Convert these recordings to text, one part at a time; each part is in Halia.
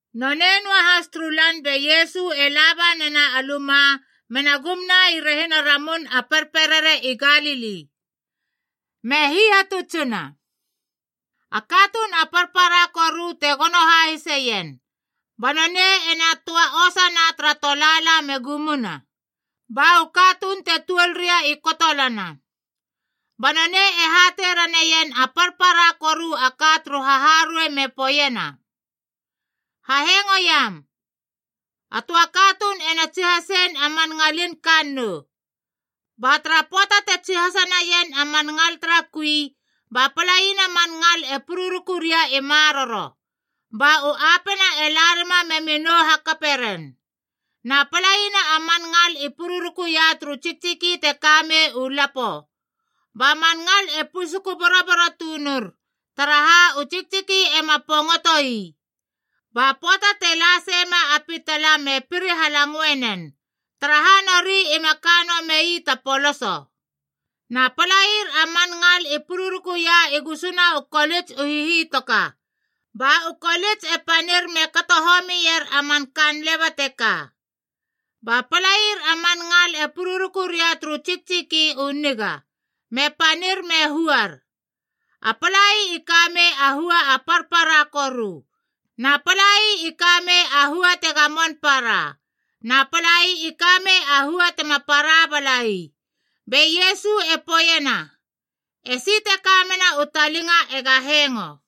Nonei noahas turu lan be Iesu e la ba nena a luma mena gumna i rehina Ramun a Perperere i Galili, me hihatutsina. A katuun a parpara koru te gono hahiseien, ba nonei ena töa osana tara tolaala me gumna, ba u katuun te tuolria i kotolana. Ba nonei e hatei raneien a parpara koru a ka turu haharuei me poeiena, “Hahengoiam. A töa katuun ena tsihasein a man ngalin kannou. Ba tara pöata te tsihasa naien a man ngal tara kui, ba palaina a man ngal e pururuku ria i maroro, ba u apena e la rima memi nou hakape ren. Na palaina a man ngal i pururukuia turu tsiktsiki te kamei u lapo, ba man ngal e pusuku boroboro tunur, taraha u tsiktsiki ema pongotoi. Ba pöata te la seima a pitala me piri halangoe nen, taraha nori ima kanoa mei ta poloso. Na palair a man ngal i pururukuia i gusuna u kolits u hihitoka, ba u kolits e panir me kato homier a man kaan leba teka. Ba palair a man ngal e pururuku ria turu tsiktsiki u niga, me panir me huar. A palai i ka mei a hua a parpara koru, na palai i ka mei a hua te gamon para, na palai i kamei a hua tema para balai.” Be Iesu e poeiena, “Esi te kamena u talinga ega hengo.”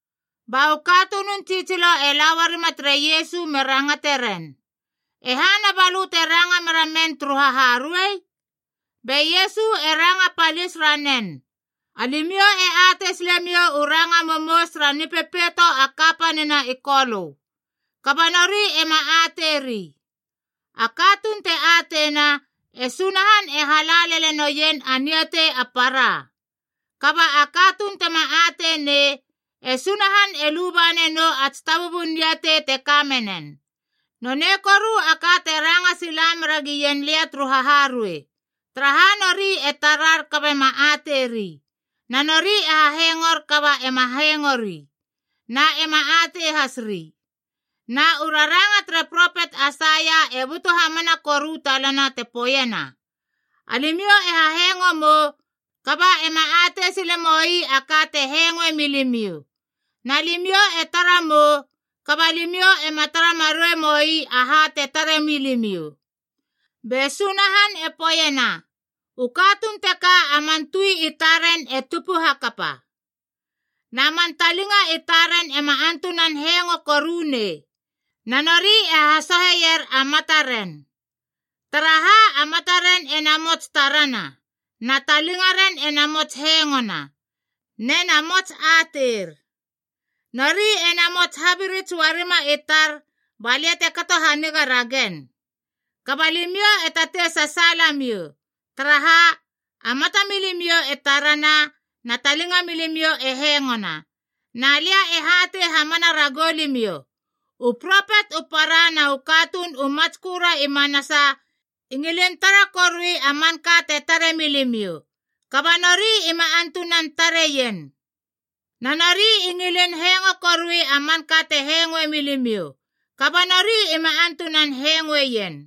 Ba u katunun tsitsilo e la uarima tere Iesu me rangate ren, “E hana ba lö te ranga meramen turu haharuei?” Be Iesu e ranga palis ranen, “Alimiou e atei silemiou u ranga momous tara nipepeito kapanina i Kolö. Kaba nori ema ateiri. “A katuun te ateina, e Sunahan e hala lele noien a niatei a para. Kaba a katuun tema ateinei, e Sunahan e luba nanou a tsitabubun niatei te ka menen. Nonei koru a ka te ranga sila meragien lia turu haharuei, taraha nori e tarar kaba ema tarari, na nori e hahengor kaba ema hengori na ema atei has ri. Na u raranga tere propet Aisaia e butu hamana koru talana te poeiena, ‘Alimiou e hahengo mou kaba ema atei sile moi a ka te hengoe milimiou. Na limiou e tara mou, kaba limiou ema tara marei moi aha te tare milimiou. Be Sunahan e poeiena, U katuun teka a man tui i taren e tupu hakapa. Na man talinga i taren ema antunan hengo korunei, na nori e hasoheier a mataren. Taraha, a mataren e namots tarana, na talingaren e namots hengona, ne na mots ateir. Nori ena mots habirits uarima i tar balia te kato haniga ragen.’ “Kaba limiou e tatei sasaalamiou. Taraha, a mata milimiou e tarana, na talinga milimiou e hengona. Na lia e hatei hamana ragou limiou! U propet u para na u katuun u matsköra i manasa i ngilin tara korui a manka te tare milimiou, kaba nori ima antunan tareien. Na nori i ngilin hengo korui a manka te hengoe milimiou, kaba nori ima antunan hengoeien.”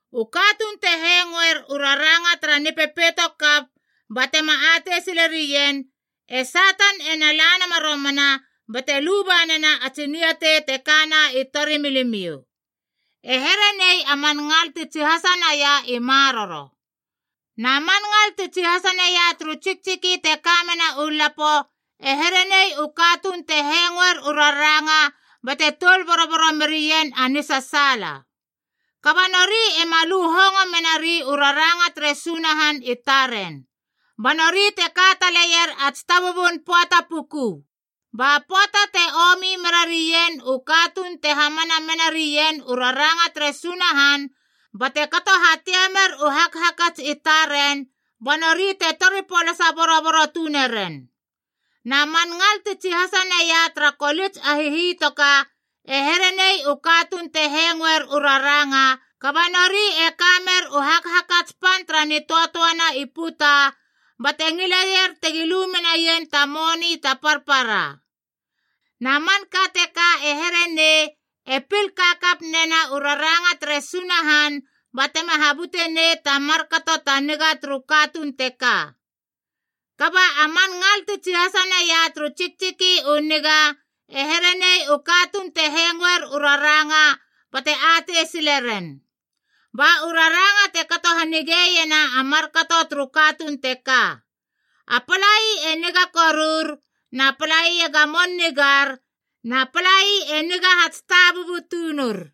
U katuun te hengoer u raranga tara nipepeito kap ba tema atei silerien, e Satan ena la nama romana bate lubanena a tsi niatei te kana i tori milimiou. E herenei a man ngal ti tsihasa naia i maroro. Na man ngal ti tsihasa naia turu tsiktsiki te ka mena u lapo e here nei u katuun te hengoer u raranga bate toul boroboro merien a nisasaala. Kaba nori ema lu hongo menari u raranga tere Sunahan i taren, ba nori te ka taleier a tsitabubun pöata puku. Ba pöata te omi mera rien u katuun te hamana mena rien u raranga tere Sunahan bate kato hatiamer u hakhakats i taren, ba nori te tori polasa boroboro tuneren. “Na man ngal ti tsihasa naia tara kolits a hihitoka e here nei u katuun te hengoer u raranga, kaba nori e ka mer u hakhakats pan tara nitöatöana i puta, bate ngileier tegi lu menai ta moni ta parpara. Na manka teka e here nei e pil kakap nena u raranga tere Sunahan batema habute nei ta markato ta niga turu katuun teka. Kaba a man ngal ti tsihasa naia turu tsiktsiki u niga e here nei u katuun te hengoer u raranga bate atei sile ren. Ba u raranga te kato hanige iena a markato turu katuun teka: a palai e niga korur, na palai e gamon nigar na palai e niga hatsitabubu tunur.”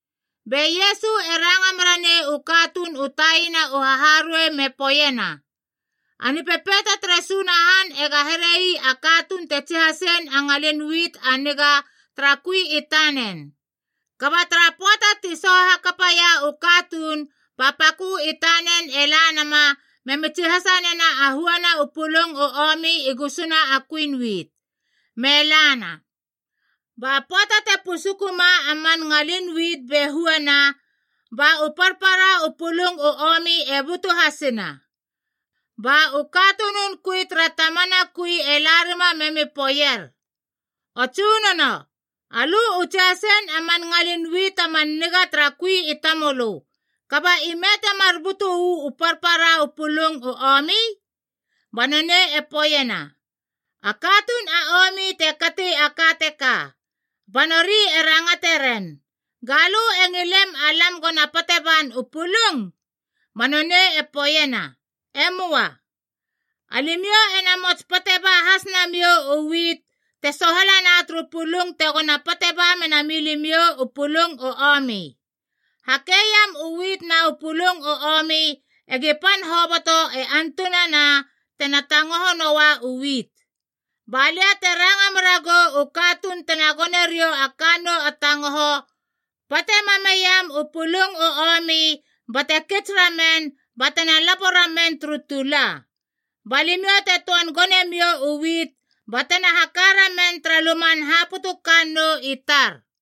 Be Iesu e ranga mera nei u katuun u taina u haharuei me poeiena, “A Nipepeito tere Sunahan ega herei a katuun te tsihasein a ngalin wit a niga tara kui i tanen. Kaba tara pöata ti soho hakapaia u katuun ba pakö i tanen e la nama memi tsihasa nena a huana u pulung u omi i gusuna a kuin wit, me lana. Ba pöata te pusukuema a man ngalin wit be huana, ba u parpara u pulung u omi e butu hasina. “Ba u katunun kui tere tamana kui e la rima memi poeier, ‘O tsunono, alö u tsihasein a man ngalin wit a man niga tara kui i tamölö, kaba ime temar butu uu parpara u pulung u omi?’ Ba nonei e poeiena, ‘A katuun a omi te kati a ka teka.’ Ba nori e rangate ren, ‘Galö e ngilem alam gona pate ban u pulung?’ “Ba nonei e poeiena, ‘E möa. Alimiou ena mots pate ba has namiou u wit te sohalana turu pulung tegona pate ba mena milimiou u pulung u omi. Hakeiam u wit na u pulung u omi egi pan hoboto antunana tena tangoho noa u wit. Ba lia te ranga meragou u katuun tena gone riou a kannou a tangoho, pate mam meiam u pulung u omi bate kits ramen batena lapo ramen turu tula. Ba limiou te töan gone miou u wit batena haka ramen tara luman haputu kannou i tar.’”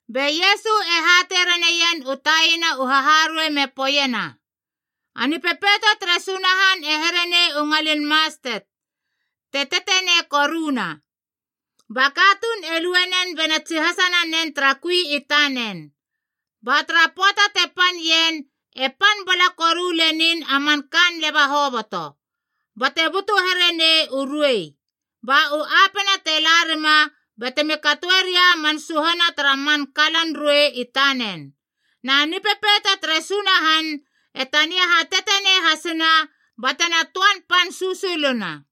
Be Iesu e hatei raneien u taina u haharuei me poeiena, “A Nipepeito tere Sunahan e here nei u ngalin mastet, te tetenei koruna. Ba katuun e lue nen bena tsihasa nanen tara kui i tanen. Ba tara pöata te pan ien, e pan bala koru lenin a man kaan leba hoboto, bate butu here nei u ruei. Ba u apena te la rima batemi katoeria a man suhana tara man kalan ruei i tanen. Na Nipepeito tere Sunahan e tania hatetenei hasina batena töan pan susuluna.”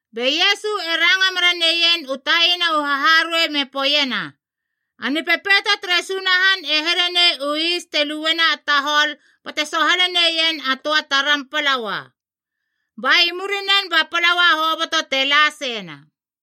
Be Iesu e ranga mera neien u taina u haharuei me poeiena, “A Nipepeito tere Sunahan e here nei u is te luena a tahol bate sohale neien a töa taram palaua, ba i murinen ba palaua hoboto te la seina.”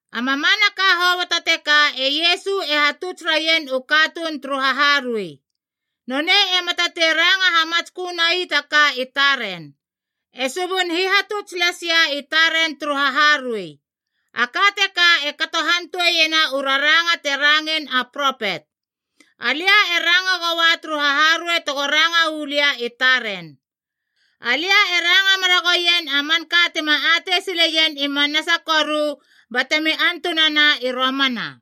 A mamanaka hoboto teka e Iesu e hatuts raien u katuun turu haharuei. Nonei ema tatei ranga hamatskö nai ta ka i taren, e subun hihatuts lasia i taren turu haharuei. A ka teka e kato hantoeiena u raranga te rangein a propet, “Alia e ranga goua turu haharuei tego ranga uu lia i taren. Alia e ranga mera gouien a manka tima atei sileien i manasa koru batemi antunana i romana.”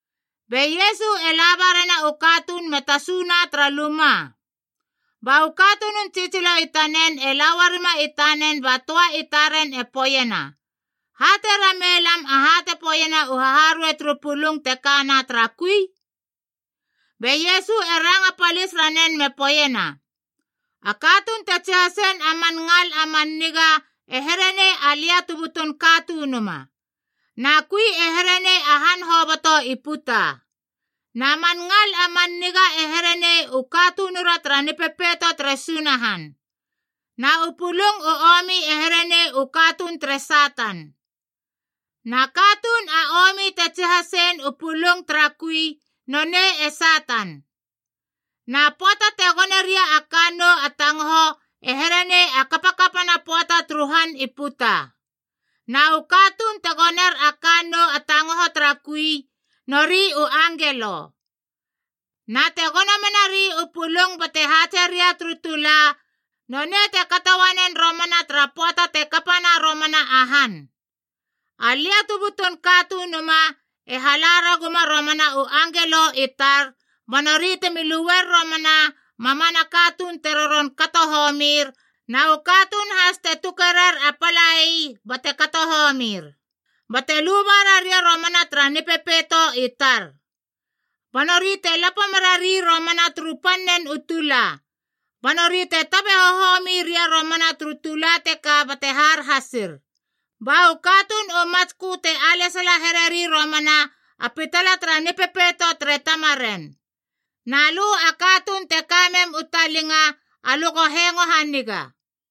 Be Iesu e la ba rena u katuun me tasuna tara luma. Ba u katunun tsitsilo i tanen e la uarima i tanen ba töa i taren e poeiena, “Hatei ramei lam aha te poeiena u haharuei turu pulung te kana tara kui.” Be Iesu e ranga palis ranen me poeiena, “A katuun te tsihasein a man ngal a man niga e here nei Alia tu butun Katunuma. Na kui e here nei u han hoboto i puta. Na man ngal a man niga e here nei u katunura tara Nipepeito tere Sunahan. Na u pulung u omi e here nei u katuun tere Satan. Na katuun a omi te tsihasein u pulung tara kui, nonei e Satan. Na pöata te gone ria a kannou a tangoho e here nei a kapakapana pöata turu han i puta. Na u katuun te goner a kannou a tangoho tara kui, nori u angelo. Na te gono menari u pulung bate haatse ria turu tula, nonei te kato uanen romana tara pöata te kapana romana a han. Alia tu butun Katunuma e hala raguma romana u angelo i tar, ba nori temi luer romana a mamana katuun te roron kato homir na u katuun has te tuke rer a palai bate kato homir, bate luba raria romana tara Nipepeito i tar. Ba nori te lapo merari romana turu pannen u tula. Ba nori te tabe hohomi ria romana turu tula teka bate har hasir. Ba u katuun u matskö te alesala hereri romana a pitala tara Nipepeito tere Tamaren. Na lö a katuun te ka mem u talinga alö go hengo haniga!”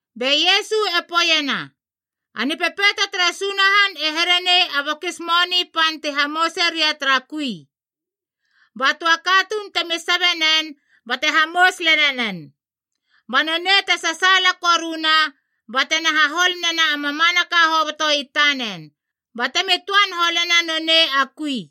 Be Iesu e poeiena, “A Nipepeito tere Sunahan e here nei a bokis moni pan te hamouse ria tara kui. Ba töa katuun temi sabe nen bate hamous lele nen. Ba nonei te sasaala koruna, batena hahol nena a mamanaka hoboto i tanen, batemi töan holena nonei a kui.”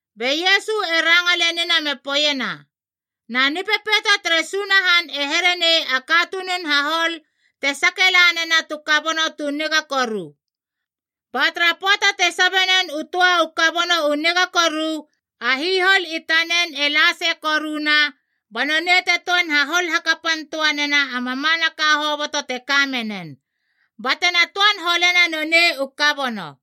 Be Iesu e ranga lenina me poeiena, “Na Nipepeito tere Sunahan e here nei a katunun hahol te sake la nena tu kabono tu niga koru. Ba tara pöata te sabe nen u töa u kabono u niga koru, a hihol i tanen e la sei koruna, ba nonei te töan hahol hakapan töa nena a mamanaka hoboto te ka menen, batena töan holena nonei u kabono.”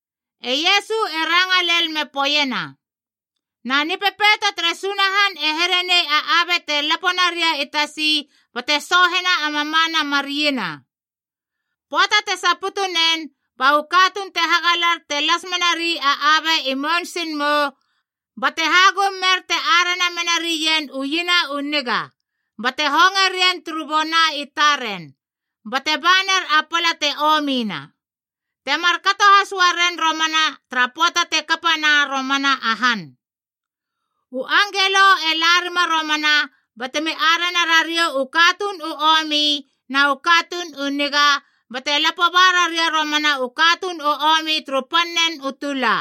E Iesu e ranga lel me poeiena, “Na Nipepeito tere Sunahan e here nei a abe te lapo naria i tasi bate soohena a mamana mar iena. Pöata te saputu nen, ba u katuun te hagalar te las menari a abe i mounsingmou bate hagum mer te arena menarien u iena u niga, bate honge rien turu bona i taren, bate baner a pala te omina. Te markato has uaren romana tara pöata te kapana romana a han. U angelo e la rima romana batemi arena rariou u katuun u omi na u katuun u niga, bate lapo ba raria romana u katuun u omi turu pannen u tula.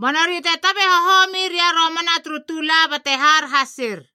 Ba nori te tabe hohomi ria romana turu tula bate har hasir.”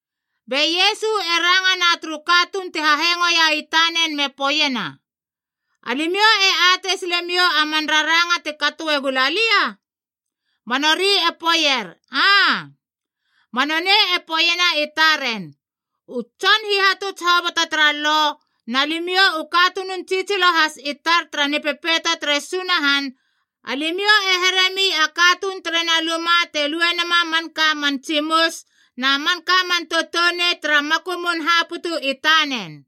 Be Iesu e rangana turu katuun ti hahengoia i tanen me poeiena, “Alimiou e atei sile miou a man raranga te katoe gula lia?” Ba nori i poeier, “Aa.” Ba nonei e poeiena i taren, “U tson hihatuts hoboto tara Lo, na limiou u katunun tsitsilo has i tar tara Nipepeito tere Sunahan, alimiou e heremi a katuun terena luma te lue nama a manka a man tsimus na manka man toutounei tara makumun haputu i tanen.”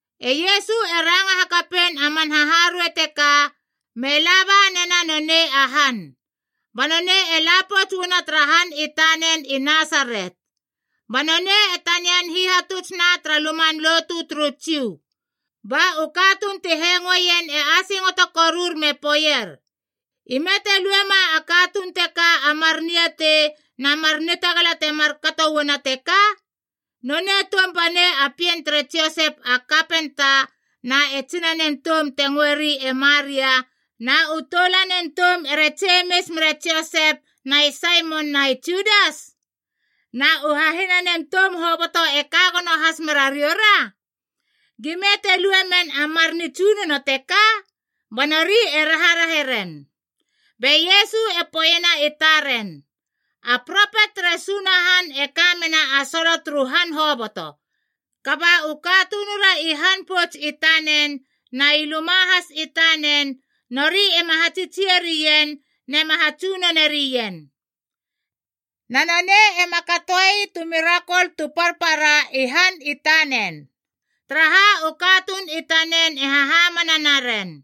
E Iesu e ranga hakapein a man haharuei teka, me la ba nena nonei a han. Ba nonei e la pouts uana tara han i tanen i Nasaret. Ba nonei e tanian hihatutsna tara luman lotu turu Jiu. Ba u katuun ti hengoeien e asingoto korur me poeier, “Ime te luema a katuun teka a mar niatei na mar nitagala temar kato uana teka? Nonei toum banei a pien tere Josep a kapenta na e tsinanen toum te ngöeri e Maria na u toulanen toum ere Jemis mere Josep na e Saimon na e Judas? Na u hahinanen toum hoboto e ka gono has merariora? Gime te lue men a mar nitsunono teka?” Ba nori e raharahe ren. Be Iesu e poeiena i taren, “A propet tere Sunahan e ka mena a solo turu han hoboto. Kaba u katunura i han pouts i tanen na i luma has i tanen nori ema hatsitsie rien nema hatsunone rien.” Na nonei ema katoei tu mirakol tu parpara i han i tanen, taraha u katuun i tanen e hahamana naren.